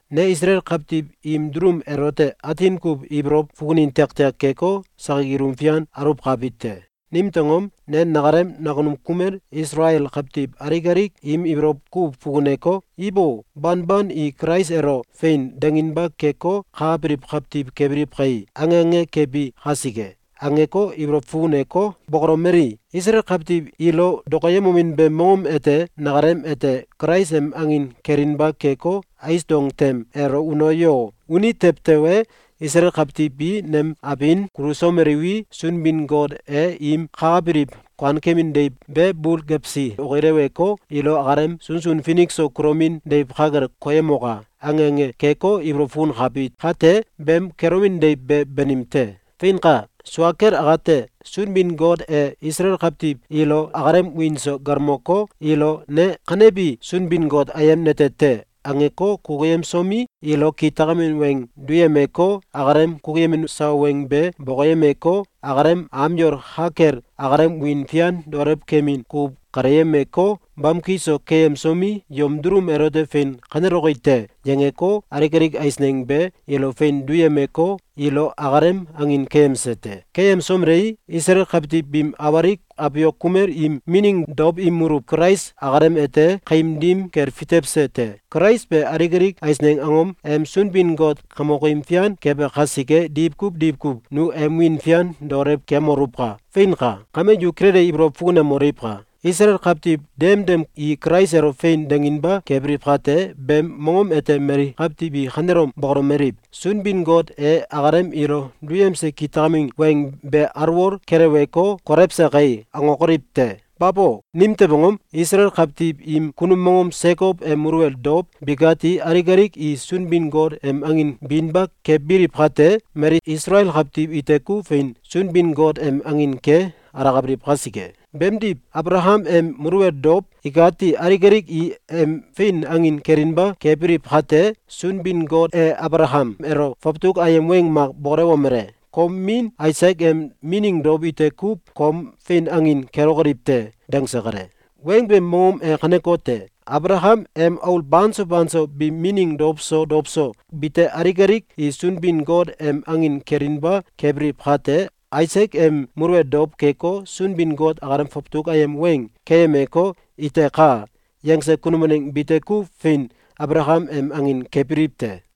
Ne Isalael kawtiw im dulum elote atin kuw ibolow fukunin tiaktiak keko, sakik ilum fian aluwkabi te. Nimtew angom? Ne nakalem nakunum kumel Isalael kawtiw alik alik im ibolow kuw fukuneko, “Ibo! Banban i Kulais elo ‘Fein!’, danginba keko, kakabiliw kawtiw kebiliw kai!”, ange ange kebi kasike. Angeko, ibolow fukuneko, bokolomeli: “Isalael kawtiw ilo dokoyemomin beem mongom ete nakalem ete Kulais em angin kelinba keko, ais dong tem elo uno yo! Uni tew tewe, Isalael kawtiw bi nem abin kulusomeliwi, Sunbin-Got e im kakabiliw kuankemin deiw be bul gewsi okileweko, ilo akalem sunsun finik so kulomin deiw ka kel koyemoka!”, ange ange keko, ibolow fukunkabi kate, beem kelomin deiw be banim te. Feinka! Sua kel akate, Sunbin-Got e Isalael kawtiw ilo akalem wiin so galmoko, ilo “Ne kanebi Sunbin-Got ayem nete te!”, angeko, kukuyemsomi, ilo kitakamin weng duyemeko, akalem kukuyemin sawa weng be bokoyemeko, akalem am yol ka kel akalem wiin fian daolew kemin kukuw kaleyemeko, bamki so keyemsomi, “Yom dulum elote fein kaneloki te!”, yangeko, alik alik eisneng be ilo fein duyemeko, ilo akalem angin keyemse te. Keyemsomelei, Isalael kawtiw biim awalik abiok kumel im mining dow im muluw Kulais akalem ete kaim dim kel fitewse te. Kulais be alik alik eisneng angom em Sunbin-Got kamokim fian kebe kasike, diwkuw diwkuw nu em wiin fian daolew kemoluwka! Feinka! Kame yu kilele ibolow fukunemoliwka! Isalael kawtiw demdem i Kulais elo “Fein!”, danginba kebiliw kate, beem mongom ete mali kawtiw i kanelom bokolomeliw: “Sunbin-Got e akalem ilo duyemse kitakamin weng be alwol keleweko, kolewse kai!”, angokoliw te! Babo! Nimtew angom? Isalael kawtiw im kunum mongom Sekow em muluwel dow bikati alik alik i Sunbin-Got em angin binba kebiliw kate, mali Isalael kawtiw ite kuw fein Sunbin-Got em angin ke alakabiliw kasike. Beemdiw, Abalakam em muluwel dow ikati alik alik i em fein angin kelinba kebiliw kate, Sunbin-Got e Abalakam elo fawtuk ayem weng mak bokolewomele: “Kom min Aisak em mining dow ite kuw kom fein angin kelokoliw te!”, dangse kale. Weng beem mongom ete kanekote: Abalakam em aul banso banso biim mining dow so dow so bite alik alik i Sunbin-Got em angin kelinba kebiliw kate, Aisak em muluwel dow keko, Sunbin-Got akalem fawtuk ayem weng keyemeko, “Iteka!”, yangse kunum waneng bite kuw fein Abalakam em angin kebiliw te.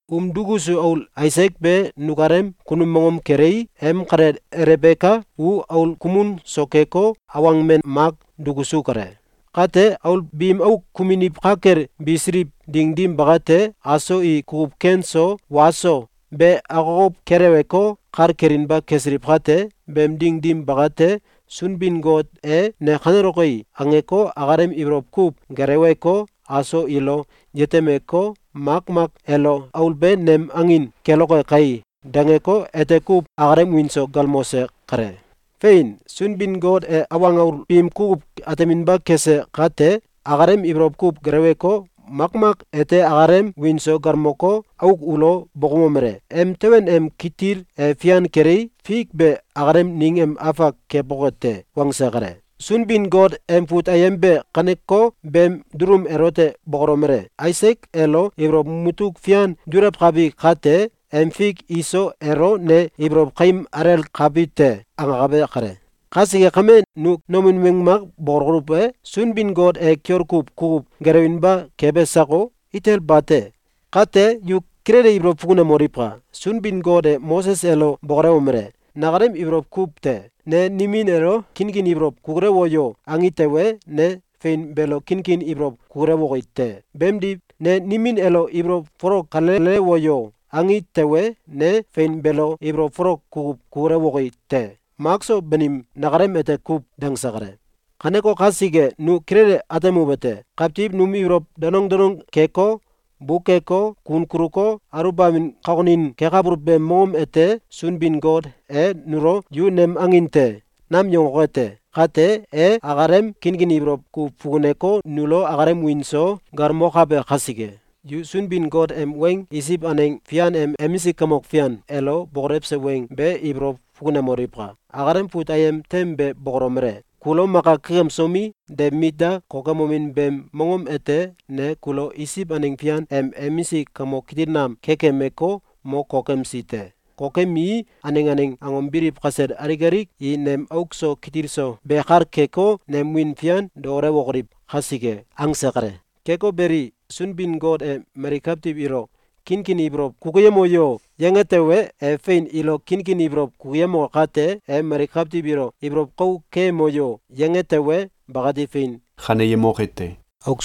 Um dukusu aul Aisak be nukalem kunum mongom kelei, em kalel Elebeka u aul kumun so keko, awang men mak dukusu kale. Kate, aul biim auk kumuniw ka kel bisiliw ding dim bakate, aso i kukuw ken so wa so be akokow keleweko, kal kelinba kesiliw kate, beem ding dim bakate, Sunbin-Got e “Ne kaneloki!”, angeko, akalem ibolow kuw geleweko, aso ilo yetemeko, makmak elo “Aul be nem angin keloke kai!”, dangeko, ete kuw akalem wiin so galmose kale. Fein! Sunbin-Got e awang aul biim kukuw ateminba kese kate, akalem ibolow kuw geleweko, makmak ete akalem wiin so galmoko, auk ulo bokoumomele: “Emteben em kitil e fian kelei, fik be akalem ning em afak keboke te.”, wangse kale. Sunbin-Got em fut ayem be kaneko beem dulum elote bokolomele: “Aisak elo ibolow mutuk fian dulewkabi kate, em fik Iso elo ne ibolow kaim alelkabi te.”, angakabe kale. Kasike kame, nu nomin weng mak bokoluw e? Sunbin-Got e kiol kuw kukuw gelewinba kebe sako? Itel bate! Kate yu kilele ibolow fukunemoliwka! Sunbin-Got e Moses elo bokolewomele: “Nakalem ibolow kuw te. Ne nimin elo ‘Kinkin ibolow kukulewo yo!’, angi tewe, ne fein beelo kinkin ibolow kukulewoki te. Beemdiw, ne nimin elo ‘Ibolow folok kalelewo yo!’, angi tewe, ne fein beelo ibolow folok kukuw kukulewoki te. Mak so banim, nakalem ete kuw.”, dangse kale. Kaneko kasike nu kilele atemuwete: Kawtiw num ibolow danong danong keko, bukeko, kun kuluko, aluwbamin kokonin kekabuluw beem mongom ete Sunbin-Got e nulo “Yu nem angin te!”, nam yangoke te. Kate, e akalem kinkin ibolow kuw fukuneko, nulo akalem wiin so galmokabe kasike. Yu Sunbin-Got em weng Isiw aneng fian em emisik kamok fian elo bokolewse weng be ibolow fukunemoliwka! Akalem fut ayem tem be bokolomele: “Kulo maka kekemsomi, de mit da kokemomin beem mongom ete ne kulo Isiw aneng fian em emisik kamok kitil nam kekemeko, mo kokemsi te. Kokemii, aneng aneng angom biliw kasel alik alik i nem auk so kitil so be kal keko, nem wiin fian daolewokoliw kasike.”, angse kale. Keko beli, Sunbin-Got e mali kawtiw ilo “Kinkin ibolow kukuyemo yo!”, yange tewe, e fein ilo kinkin ibolow kukuyemoke kate, e mali kawtiw ilo “Ibolow kau keyemo yo!”, yange tewe, bakati fein kaneyemoke te.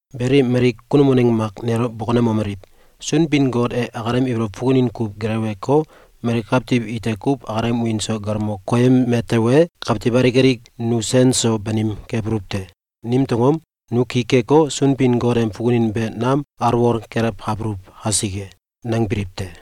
Beli, mali kunum waneng mak nelo bokonemomeliw: “Sunbin-Got e akalem ibolow fukunin kuw geleweko, mali kawtiw ite kuw akalem wiin so galmo koyeme tewe, kawtiw alik alik nu sen so banim kebuluw te! Nimtew angom? Nu ki keko, Sunbin-Got em fukunin be nam alwol kelewkabuluw kasike!”, nangbiliw te.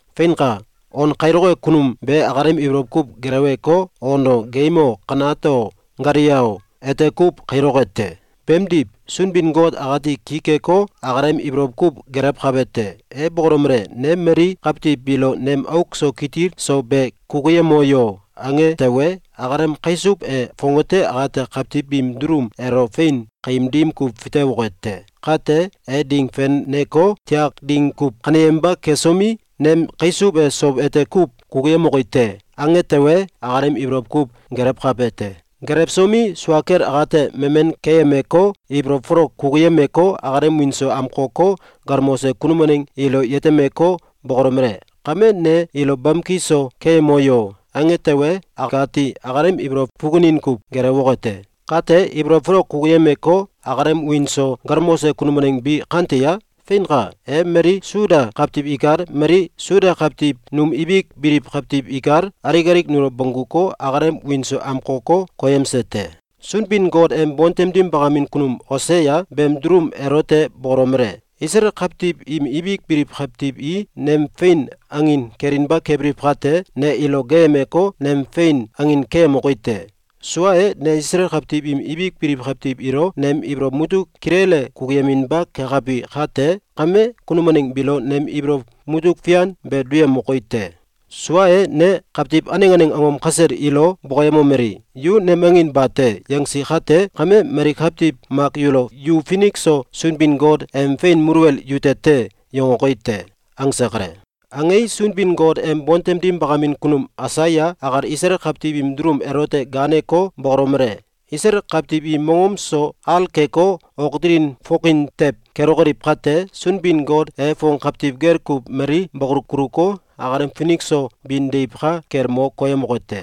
Feinka! On kailoke kunum be akalem ibolow kuw geleweko, on o, geim o, kanat o, galia o, ete kuw kailoke te. Beemdiw, Sunbin-Got akati ki keko, akalem ibolow kuw gelewkabe te. E bokolomele: “Ne mali kawtiw biilo nem auk so kitil so be kukuyemo yo!”, ange tewe, akalem kaisuw e fongate akate kawtiw biim dulum elo fein kaim dim kuw fitewoke te. Kate, e ding feneko, tiak ding kuw kaneyeminba kesomi, “Nem kaisuw e sow ete kuw kukuyemoki te!”, ange tewe, akalem ibolow kuw gelewkabe te. Gelewsomi, sua kel akate memen keyemeko, ibolow folok kukuyemeko, akalem wiin so amkoko, galmose kunum waneng ilo yetemeko, bokolomele: “Kame ne ilo bamki so keyemo yo!”, ange tewe, akati akalem ibolow fukunin kuw gelewoke te. Kate, ibolow folok kukuyemeko, akalem wiin so galmose kunum waneng bi kante ye? Feinka! E mali Suda kawtiw ikal, mali Suda kawtiw num ibik biliw kawtiw ikal, alik alik nulo bongguko, akalem wiin so amkoko, koyemse te. Sunbin-Got em bontem dim bakamin kunum Osea beem dulum elote bokolomele: “Isalael kawtiw im ibik biliw kawtiw i nem fein angin kelinba kebiliw kate, ne ilo gaayemeko, nem fein angin keyemoki te. Sua e, ne Isalael kawtiw im ibik biliw kawtiw ilo nem ibolow mutuk kilele kukuyeminba kekabi kate kame, kunum waneng biilo nem ibolow mutuk fian be duyemoki te. Sua e, ne kawtiw aneng aneng angom kasel ilo bokoyemomeli: ‘Yu nem angin bate!’, yangsi kate kame, mali kawtiw mak yulo ‘Yu finik so Sunbin-Got em fein muluwel yute te!’, yangoki te.”, angse kale. Angei, Sunbin-Got em bontem dim bakamin kunum Aisaya akal Isalael kawtiw im dulum elote gaaneko, bokolomele: “Isalael kawtiw i mongom so al keko, ok dilin fokin tew kelokoliw kate, Sunbin-Got e fong kawtiw gel kuw mali bakolu kuluko, akalem finik so bin deiw ka kel mo koyemoke te.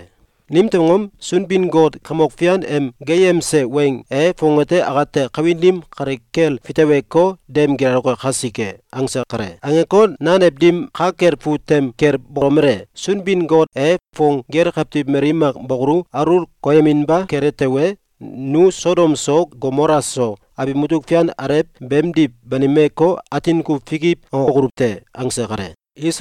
Nimtew angom? Sunbin-Got Kamok Fian em geeyemse weng e fongate akate kawin dim kale kel fiteweko, dem gilaloke kasike.”, angse kale. Angeko, nanew dim ka kel fut tem kel bolomele: “Sunbin-Got e fong gel kawtiw mali mak bakolu alul koyeminba kele tewe, nu Sodom so, Gomola so abiw mutuk fian alew beemdiw banimeko, atin kuw fikiw angokoluw te.”, angse kale.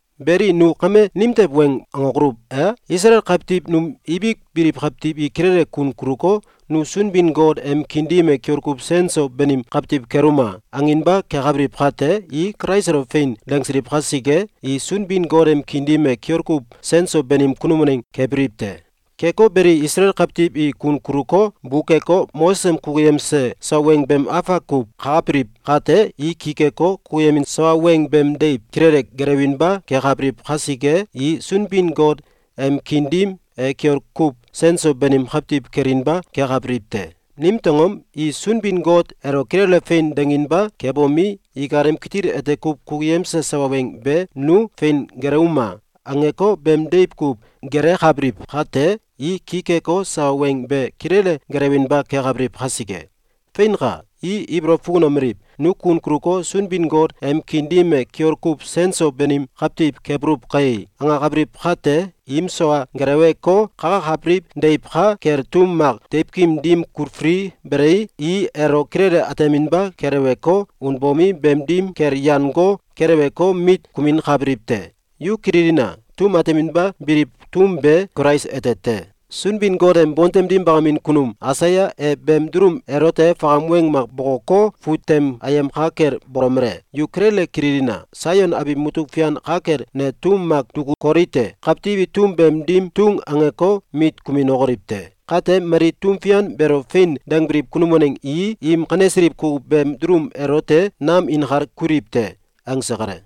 Beli, nu kame nimtew weng angokoluw e? Isalael kawtiw num ibik biliw kawtiw i kilele kun kuluko, “Nu Sunbin-Got em kiin dim e kiol kuw sen so banim kawtiw keluma!”, anginba kekabliw kate, i Kulais elo “Fein!”, dangsiliw kasike, i Sunbin-Got em kiin dim e kiol kuw sen so banim kunum waneng kebiliw te. Keko beli, Isalael kawtiw i kun kuluko, bukeko, Moses em kukuyemse sawa weng beem afak kuw kakabiliw kate, i ki keko, kukuyemin sawa weng beem deiw kilele gelewinba kekabiliw kasike, i Sunbin-Got em kiin dim e kiol kuw sen so banim kawtiw kelinba kekabiliw te. Nimtew angom? I Sunbin-Got elo kilele “Fein!”, danginba kebomi, ikalem kitil ete kuw kukuyemse sawa weng be “Nu fein gelewuma!”, angeko, beem deiw kuw gelekabiliw kate, i ki keko, sawa weng be kilele gelewinba kekabiliw kasike. Feinka! I ibolow fukunomeliw: “Nu kun kuluko, Sunbin-Got em kiin dim e kiol kuw sen so banim kawtiw kebuluw kai!”, angakabiliw kate, im sawa geleweko, kakakabiliw deiw ka kel tum mak deiwkim dim kulfili belei, i elo kilele ateminba keleweko, unbomi, beem dim kel yan go keleweko, mit kuminkabiliw te. Yu kililina! Tum ateminba biliw tum be Kulais ete te. Sunbin-Got em bontem dim bakamin kunum Aisaya e beem dulum elote fakam weng mak bokoko, fut tem ayem ka kel bolomele: “Yu kilele kililina! Saion abiw mutuk fian ka kel ne tum mak duku koli te, Kawtiw i tum beem dim tung angeko, mit kuminokoliw te. Kate, mali tum fian beelo “Fein!”, dangbiliw kunum waneng i im kanesiliw kukuw beem dulum elote nam inkal kuliw te.”, angse kale.